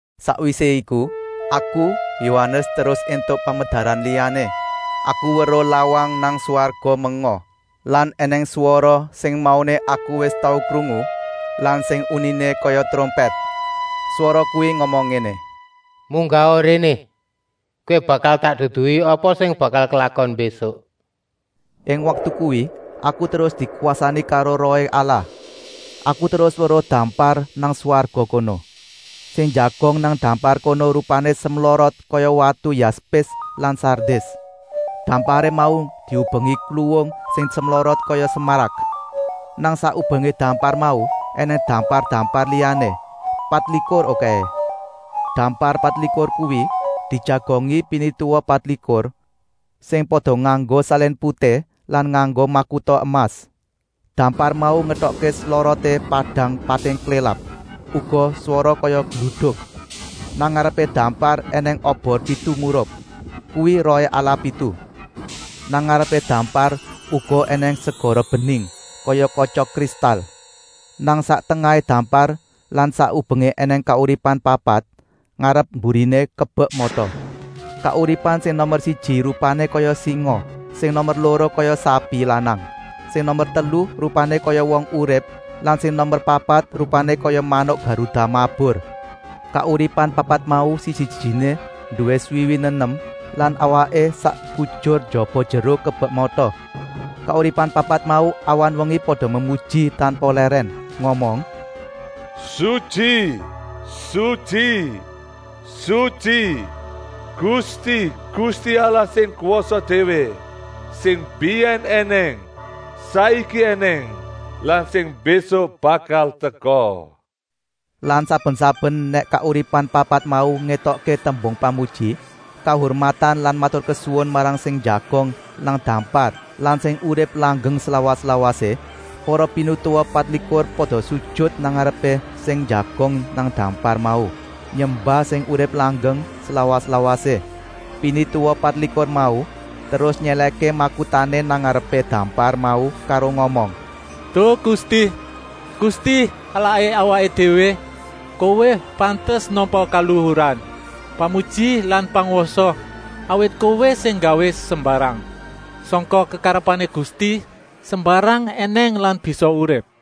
Sakwisé iku, aku, Yohanes, terus éntuk pamedaran liyané. Aku weruh lawang nang swarga menga lan ènèng swara sing mauné aku wis tau krungu lan sing uniné kaya trompèt. Swara kuwi ngomong ngéné: “Munggaha réné. Kowé bakal tak duduhi apa sing bakal klakon mbésuk” Ing waktu kuwi aku terus dikwasani karo Rohé Allah. Aku terus weruh dampar nang swarga kono. Sing njagong nang dampar kono rupané semlorot kaya watu yaspis lan sardis. Damparé mau diubengi kluwung sing semlorot kaya smarak. Nang sak ubengé dampar mau ènèng dampar-dampar liyané, patlikur okèhé. Dampar patlikur kuwi dijagongi pinituwa patlikur, sing pada nganggo salin putih lan nganggo makuta emas. Dampar mau ngetokké sloroté padang pating klélap, uga swara kaya gluduk. Nang ngarepé dampar ènèng obor pitu murup: kuwi Rohé Allah pitu. Nang ngarepé dampar uga ènèng kaya segara bening, kaya katya kristal. Nang sak tengahé dampar lan sak ubengé ènèng kauripan papat, ngarep-mburiné kebek mata. Kauripan sing nomer siji rupané kaya singa, sing nomer loro kaya sapi lanang, sing nomer telu rupané kaya wong urip lan sing nomer papat rupané kaya manuk garuda mabur. Kauripan papat mau siji-sijiné nduwé swiwi nenem lan awaké sak kujur njaba-njero kebek mata. Kauripan papat mau awan-wengi pada memuji tanpa lèrèn, ngomong: “Sutyi, sutyi, sutyi, Gusti, Gusti Allah sing kwasa déwé, sing mbiyèn ènèng, saiki ènèng lan sing mbésuk bakal teka.” Lan saben-saben nèk kauripan papat mau ngetokké tembung pamuji, kahurmatan lan maturkesuwun marang sing njagong nang dampar lan sing urip langgeng slawas-lawasé, para pinituwa patlikur pada sujut nang ngarepé sing njagong nang dampar mau, nyembah sing urip langgeng slawas-lawasé. Pinituwa patlikur mau terus nyèlèhké makutané nang ngarepé dampar mau karo ngomong: “Duh Gusti, Gusti Allahé awaké déwé, Kowé pantes nampa kaluhuran, pamuji lan pangwasa, awit Kowé sing nggawé sembarang. Sangka kekarepané Gusti sembarang ènèng lan bisa urip.”